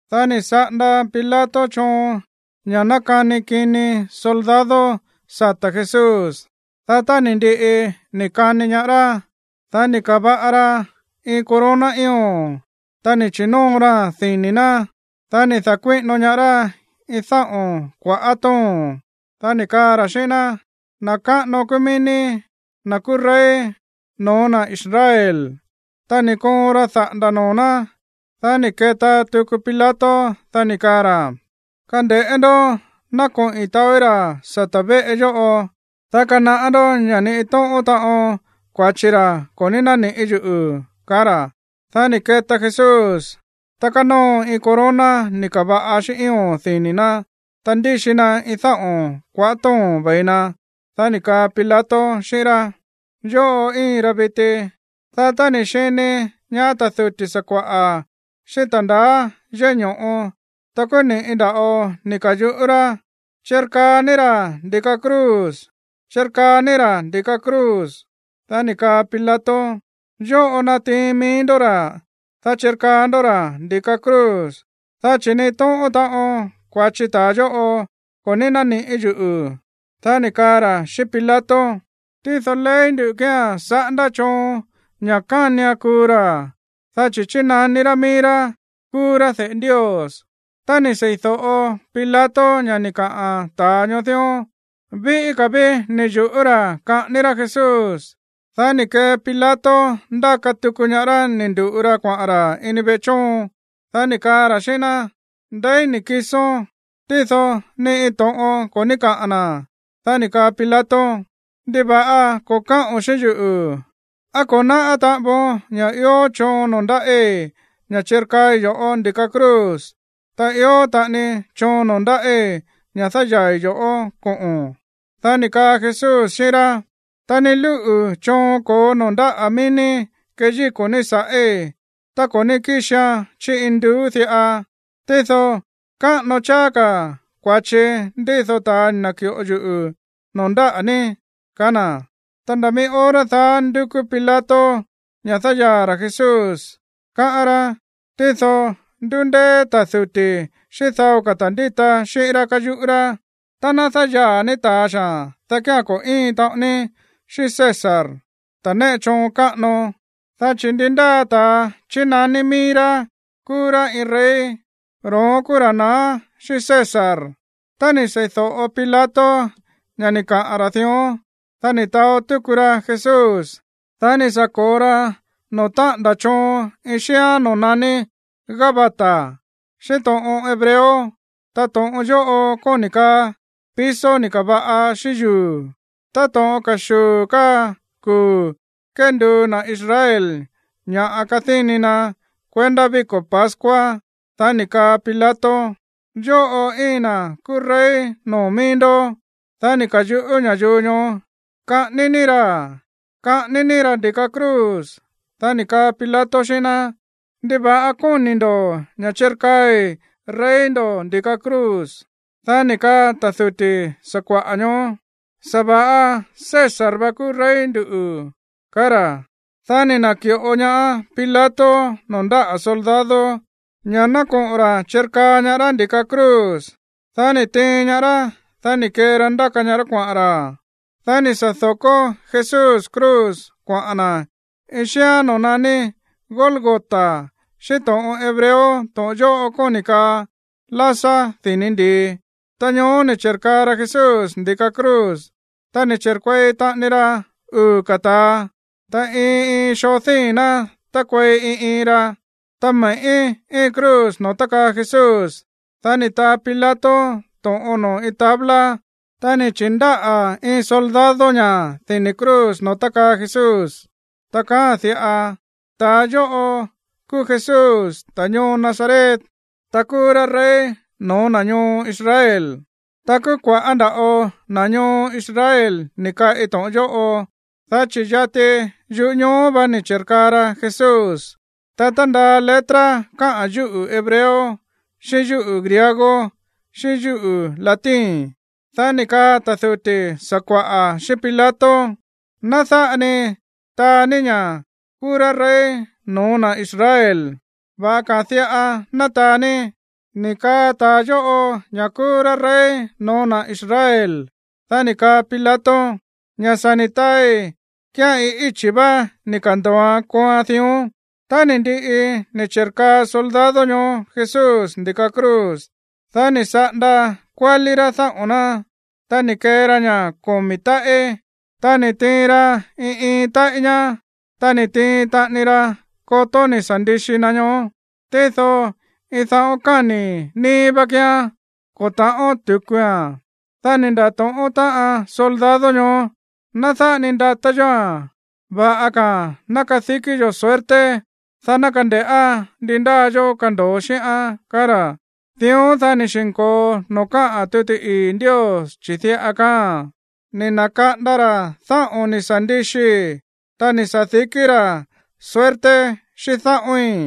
Dá ni̱ saꞌanda Pilato choon ña̱ ná kani kini soldado sata̱ Jesús. Dá tá ni̱ ndiꞌi ni̱ kani ñaá rá, dá ni̱ ka̱va̱ꞌa ra iin corona ío̱n, ta ni̱ chi̱nóo raa̱n dini̱ ná. Dá ni̱ da̱kuíꞌino ñaá rá iin dáꞌo̱n kuaꞌá to̱ón, dá ni̱ kaa ra̱ xíꞌín ná: ―Na̱ káꞌano kúú mií ní, na̱ kúú rey no̱ó na̱ Israel. Ta ni̱ koon ra daꞌa̱nda̱ noo̱ ná. Dá ni̱ keta tuku Pilato, dá ni̱ kaa ra̱: ―Kande̱ꞌé ndó, ná koꞌi̱n taóí ra̱ sata̱ véꞌe yóꞌo, dá kanaꞌá ndó ña̱ ni iin tóꞌón taꞌon kua̱chi ra ko̱ ní náníꞌi̱ yuꞌu̱ ―kaá ra̱. Dá ni̱ keta Jesús, ta kánóo iin corona ni̱ ka̱va̱ꞌa xíꞌín ío̱n dini̱ ná, ta ndíxi na iin dáꞌo̱n kuaꞌá to̱ón ve̱i na. Dá ni̱ kaa Pilato xíꞌín rá: ―Yóꞌo íin ra viti. Dá tá ni̱ xini ñaá ta̱ duti̱ sakua̱ꞌa̱ xíꞌín ta̱ ndaá yéꞌé ño̱ꞌo, ta kúú ni̱ꞌi nda̱ꞌo ni̱ ka̱yuꞌú rá: ―¡Chirkaa ní ra̱ ndi̱ka cruz! ¡Chirkaa ní ra̱ ndi̱ka cruz! Dá ni̱ kaa Pilato: ―Yóꞌo natiin mií ndó ra̱, ta chirkaa ndó ra̱ ndi̱ka cruz, dá chi̱ ni iin tóꞌón taꞌon kua̱chi ta̱a yóꞌo ko̱ ní náníꞌi̱ yuꞌu̱. Dá ni̱ kaa ra̱ xíꞌín Pilato: ―Tído ley nduꞌu̱ kía̱n saꞌándá choon ña̱ kánian kuu ra̱, dá chi̱ chínaní rá mií rá kúú rá de̱ꞌe Ndios. Tá ni̱ seídóꞌo Pilato ña̱ ni̱ kaꞌa̱n ta̱a ñoó dión, víꞌí ka̱ ví ni̱ yu̱ꞌú ra̱ kaꞌání rá Jesús. Dá ni̱ kee Pilato ndáka tuku ñaá rá ni̱ ndu̱ꞌu ra kuaꞌa̱n ra̱ ini veꞌe chóon. Dá ni̱ kaa ra̱ xíꞌín ná: ―¿Ndeí ni̱ kisón? Tído ni iin to̱ꞌon ko̱ ní káꞌa̱n na̱. Dá ni̱ kaa Pilato: ―¿Ndiva̱ꞌa ko̱ káꞌo̱n xíꞌín yuꞌu̱? ¿Á ko̱ náꞌá taꞌan voon ña̱ ió choon noo̱ ndáꞌí ña̱ chirkaai yo̱ꞌó ndi̱ka cruz, ta ió taꞌani choon noo̱ ndáꞌí ña̱ dáyaa̱i̱ yoꞌó koꞌo̱n? Dá ni̱ kaa Jesús xíꞌín rá: ―Ta ni lúꞌu̱ choon ko̱ó noo̱ ndáꞌa̱ mií ní keyíko̱ ní sa̱ꞌí tá ko̱ ní kíxian chí induú diꞌa. Tído káꞌano cháá ka̱ kua̱chi ndído ta̱ ni̱ na̱ki̱ꞌo yuꞌu̱ noo̱ ndáꞌa̱ ní ―kaá na̱. Ta nda̱ mií hora daá ndúkú Pilato ña̱ dáyaa̱ ra̱ Jesús, káꞌán rá. Tído ndúndéé ta̱ duti̱ xíꞌín dao ka̱ ta̱ ndíta xíꞌín rá káyuꞌú rá: ―Tá ná dáyaa̱ ní ta̱a xaa̱n, dá kía̱n ko̱ íin taꞌon ní xíꞌín César, ta̱ néꞌe choon káꞌano. Dá chi̱ ndi ndáa ta̱a chínaní mií rá kúú rá iin rey, ro̱ón kúú ra̱ naá xíꞌín César. Tá ni̱ sei̱do̱ꞌo Pilato ña̱ ni̱ kaꞌa̱n ra̱ dión, dá ni̱ taó túku ra Jesús. Dá ni̱ sa̱ ko̱o ra noo̱ táꞌa̱nda̱ choon iin xíán noo̱ naní Gabata xíꞌín to̱ꞌon hebreo. Ta to̱ꞌon yóꞌo kóni̱ kaa piso ni̱ ka̱va̱ꞌa xíꞌín yuu̱. Táto̱ꞌon ka̱xuu̱ káa kuu̱ kénduu na̱ Israel ña̱ kadíni na̱ kuendá víko̱ pascua, dá ni̱ kaa Pilato: ―¡Yóꞌo íin na̱ kúú rey noo̱ mií ndó! Dá ni̱ ka̱yuꞌú ña̱yuu ñoó: ―¡Kaꞌání ní ra̱, kaꞌání ní ra̱ ndi̱ka cruz! Dá ni̱ kaa Pilato xíꞌín ná: ―¿Ndiva̱ꞌa kóni̱ ndo̱ ña̱ chirkaai rey ndo̱ ndi̱ka cruz? Dá ni̱ kaa ta̱ duti̱ sakua̱ꞌa̱ ñoó: ―¡Sa̱va̱ꞌa César vá kúú rey ndu̱! ―kaá ra̱. Dá ni̱ na̱ki̱ꞌo ñaá Pilato noo̱ ndáꞌa̱ soldado, ña̱ ná koꞌo̱n ra̱ chirkaa ñaá rá ndi̱ka cruz. Dá ni̱ tiin ñaá rá, dá ni̱ kee ra ndáka ñaá rá kuaꞌa̱n ra̱. Dá ni̱ sa̱ do̱kó Jesús cruz kuaꞌa̱n na̱ iin xíán noo̱ naní Gólgota xíꞌín to̱ꞌon hebreo. To̱ꞌon yóꞌo kóni̱ kaa lásá dini̱ ndi̱i. Ta ñoó ni̱ chi̱rkaa ra Jesús ndi̱ka cruz. Ta ni̱ chi̱rkuei taꞌani ra uu̱ ka̱ ta̱a, ta iin iin xoo díi̱n ná tákuei iin iin ra. Ta me̱ꞌí íin cruz noo̱ tákaa Jesús. Dá ni̱ taa Pilato to̱ꞌon noo̱ iin tabla, ta ni̱ chi̱ndáꞌa̱ iin soldado ña̱ dini̱ cruz noo̱ tákaa Jesús. Ta kaáa̱n diꞌa: “Ta̱a yóꞌo kúú Jesús, ta̱ ñoo Nazaret, ta kúú rá rey no̱ó na̱ ñoo Israel.” Ta kúú kua̱ꞌá nda̱ꞌo na̱ ñoo Israel ni̱ kaꞌi to̱ꞌon yóꞌo, dá chi̱ yati yúꞌu̱ ñoo vá ni̱ chi̱rkaa ra Jesús. Ta tándaa letra káꞌa̱n yúꞌu̱ hebreo, xíꞌín yúꞌu̱ griego, xíꞌín yúꞌu̱ latín. Dá ni̱ kaa ta̱ duti̱ sakua̱ꞌa̱ xíꞌín Pilato: ―Ná dáꞌa ni taa ní ña̱ kúú rá rey no̱ó na̱ Israel. Va̱ꞌa ka̱a̱n diꞌa ná taa ní: “Ni̱ kaa ta̱a yóꞌo ña̱ kúú rá rey no̱ó na̱ Israel.” Dá ni̱ kaa Pilato: ―Ña̱ sa̱ ni̱ taai kía̱n iin íchi̱ vá ni̱ ka̱ndo̱oan kooan dión. Tá ni̱ ndiꞌi ni̱ chi̱rkaa soldado ñoó Jesús ndi̱ka cruz, dá ni̱ saꞌanda kuálí rá dáꞌo̱n ná. Ta ni̱ kee ra ña̱ komi̱ táꞌí, dá ni̱ tiin ra iin iin táꞌí ñá. Ta ni̱ tiin taꞌani ra kotó ni̱ sa̱ ndixi na ñoó, tído iin daꞌón káni̱ níí vá kíán, ko̱ ta̱ꞌón tu̱kua̱n. Dá ni̱ nda̱tóꞌón táꞌan soldado ñoó: ―Ná dáꞌa ni ndatá yóa̱n, va̱ꞌa ka̱a̱n ná kadikí yo̱ suerte, dá ná kande̱ꞌá ndi ndáa yoo kando̱o xíꞌán ―kaá ra̱. Dión, dá ni̱ xi̱nko̱o noo̱ káꞌa̱n tuti ii̱ Ndios, chi̱ diꞌa kaáa̱n: “Ni̱ na̱kaꞌanda ra̱ dáꞌo̱n ni̱ sa̱ ndixii, ta ni̱ sa̱dikí rá suerte xíꞌín dáꞌo̱ín.”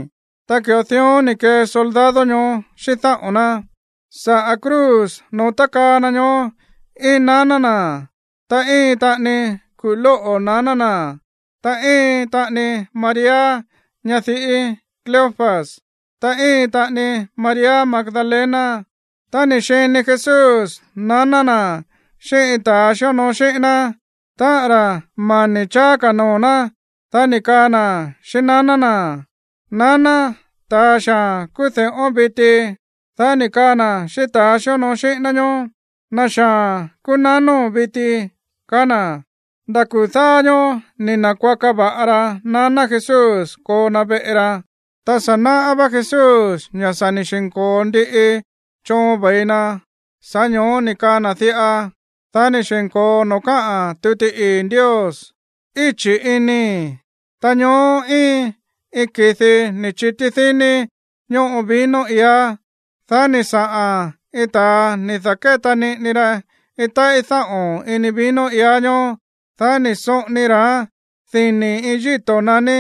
Ta ki̱ꞌo dión ni̱ kee soldado ñoó xíꞌín dáꞌo̱n ná. Saꞌa̱ cruz noo̱ tákaa na ñoó íin naná na̱, ta íin taꞌani kuꞌu̱ lóꞌo̱ naná na̱, ta íin taꞌani María, ñadiꞌí Cleofas, ta íin taꞌani María Magdalena. Tá ni̱ xini Jesús naná na̱ xíꞌín iin ta̱ xíonoo xíꞌín ná, táꞌa̱n ra̱ mani̱ cháá ka̱ noo̱ ná, dá ni̱ kaa na̱ xíꞌín naná na̱: ―Naná, ta̱a xaa̱n kúú de̱ꞌón viti. Dá ni̱ kaa na̱ xíꞌín ta̱ xíonoo xíꞌín ná ñoó: ―Na̱ xaa̱n kúú nanóo̱n viti ―kaá na̱. Nda̱ kuu̱ dáá ñóó ni̱ na̱kuaka va̱ꞌa ra naná Jesús koo na veꞌe ra. Ta sa̱ náꞌá vá Jesús ña̱ sa̱ ni̱ xi̱nko̱o ndiꞌi choon ve̱i na, sa̱ꞌá ño̱ó ni̱ kaa na̱ diꞌa, dá ni̱ xi̱nko̱o noo̱ káꞌa̱n tuti ii̱ Ndios: ―¡Íchi̱ inii̱! Ta ñoó íin iin ki̱di ni̱ chití díní ñóꞌo vino iá. Dá ni̱ saꞌa̱n iin ta̱a ni̱ da̱kéta niꞌini ra iin táꞌí dáꞌo̱n ini vino iá ñoó, dá ni̱ soꞌoni ra̱án dini̱ iin yíto̱ naní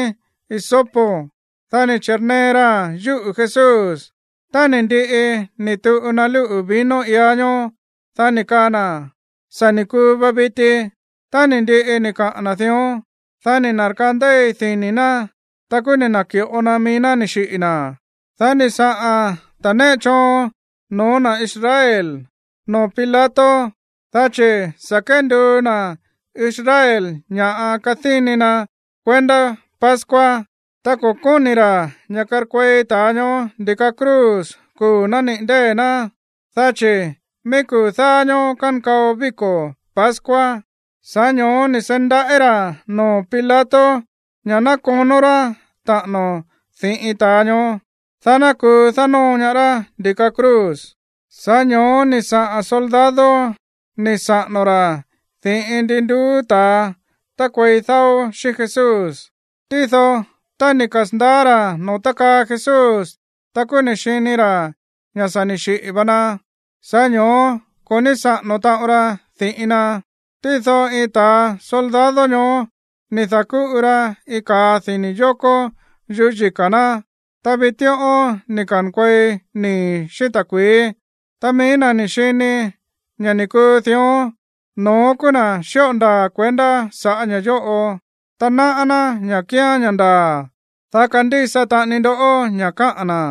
hisopo. Dá ni̱ chi̱nee raa̱n yúꞌu̱ Jesús. Tá ni̱ ndiꞌi ni̱ tuꞌu na lúꞌu̱ vino iá ñoó, dá ni̱ kaa na̱: ―Sa̱ ni̱ kuu va viti. Tá ni̱ ndiꞌi ni̱ kaꞌa̱n na̱ dión, dá ni̱ na̱rkandéi dini̱ ná, ta kúú ni̱ na̱ki̱ꞌo na mií ná ni̱ xiꞌi̱ na̱. Dá ni̱ saꞌa̱n ta̱ néꞌe choon no̱ó na̱ Israel noo̱ Pilato, dá chi̱ sa̱ kenduu na̱ Israel ña̱ꞌa kadíni na̱ kuendá pascua, ta ko̱ kóni̱ ra̱ ña̱ karkuei ta̱a ñoó ndi̱ka cruz kuu̱ nániꞌi̱ ndée̱ ná, dá chi̱ mií kuu̱ dáá ñóó kankao víko̱ pascua. Sa̱ꞌá ño̱ó ni̱ seí ndaꞌí ra̱ noo̱ Pilato ña̱ ná konó rá taꞌa̱no̱ di̱ꞌin ta̱a ñoó, dá ná kuu dánóo ñaá rá ndi̱ka cruz. Sa̱ꞌá ño̱ó ni̱ saꞌa̱n soldado ni̱ saꞌa̱no̱ ra̱ di̱ꞌin ndi nduú ta̱a tárkuei dáó xíꞌín Jesús. Tído tá ni̱ kasa̱ndaá ra̱ noo̱ tákaa Jesús, ta kúú ni̱ xini ra̱ ña̱ sa̱ ni̱ xiꞌi̱ va na, sa̱ꞌá ño̱ó ko̱ ní saꞌa̱no̱ taꞌon ra di̱ꞌin na. Tído iin ta̱ soldado ñoó ni̱ da̱kúꞌu ra iin ka̱a dini̱ yokó yuꞌú yika̱ ná, ta vitíꞌón ni̱ ka̱nkuei nii̱ xíꞌín ta̱kui̱í. Ta mií na̱ ni̱ xini ña̱ ni̱ kuu dión, no̱ón kúú na̱ xíꞌo ndaa̱ kuendá saꞌa̱ ña̱ yóꞌo, ta náꞌá ná ña̱ kíán ña̱ ndaa̱, dá kandísa taꞌani ndó ña̱ káꞌa̱n na̱.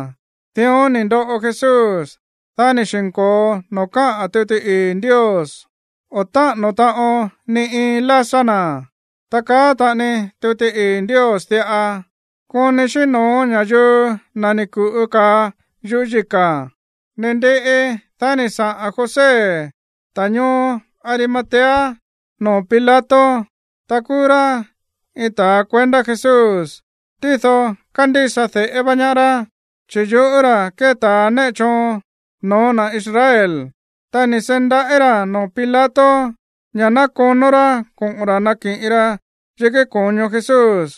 Dión ni̱ ndoꞌo Jesús, dá ni̱ xi̱nko̱o noo̱ káꞌa̱n tuti ii̱ Ndios: “O̱ táꞌa̱no̱ taꞌon ni iin lásá na̱.” Ta kaá taꞌani tuti ii̱ Ndios diꞌa: “Koni xíꞌín no̱ó ña̱yuu na̱ ni̱ ku̱ꞌu ka̱a yuꞌú yika̱.” Ni̱ ndiꞌi, dá ni̱ saꞌa̱n José, ta̱ ñoo Arimatea, noo̱ Pilato. Ta kúú rá iin ta̱ kuendá Jesús, tído kándísa de̱ꞌé va ñaá rá, chi̱ yuꞌú ra̱ kée ta̱ néꞌe choon no̱ó na̱ Israel. Ta ni̱ seí ndaꞌí ra̱ noo̱ Pilato ña̱ ná konó rá koꞌo̱n ra̱ nakiꞌin ra yikí ko̱ño Jesús.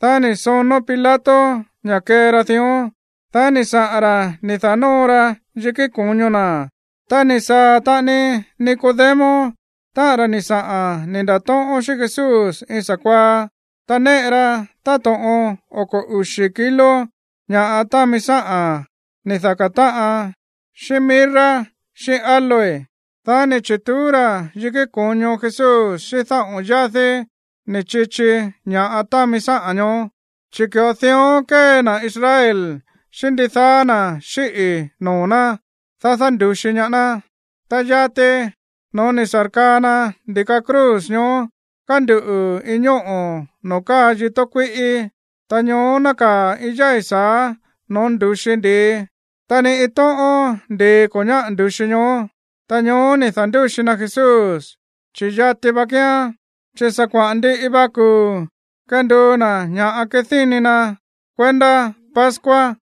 Dá ni̱ sonó Pilato ña̱ kee ra dión. Dá ni̱ saꞌa̱n ra̱ ni̱ da̱nóo ra yikí ko̱ño na̱. Ta ni̱ saa̱ taꞌani Nicodemo, táꞌa̱n ra̱ ni̱ saꞌa̱n ni̱ nda̱tóꞌón xíꞌín Jesús iin sa̱kuaá. Ta néꞌe ra táto̱ꞌon oko̱ uxi̱ kilo ña̱ támi sáꞌa̱n ni̱ daká táꞌan xíꞌín mirra xíꞌín áloe. Dá ni̱ chi̱tuú ra̱ yikí ko̱ño Jesús xíꞌín dáꞌo̱n yádí ni̱ chichi ña̱ꞌa támi sáꞌa̱n ñoó, chi̱ ki̱ꞌo dión kée na̱ Israel xíꞌín ndidaá na̱ xíꞌi̱ noo̱ ná, dá dándu̱xi ñaá ná. Ta yati noo̱ ni̱ sa̱rkaa na ndi̱ka cruz, ñoó kánduꞌu̱ iin ñóꞌo̱ noo̱ káa yitó kuíꞌí. Ta ñoó nákaa̱ iin yái̱ sa̱á noo̱ ndu̱xi ndi̱i. Ta ni iin tóꞌón ndi̱i ko̱ ñáꞌa̱ ndu̱xi ñoó. Ta ñoó ni̱ da̱ndúxi na Jesús, chi̱ yati va kíán, chi̱ sa̱ kuaꞌa̱n ndiꞌi va kuu̱ kénduu na̱ ña̱ꞌa kadíni na̱ kuendá pascua.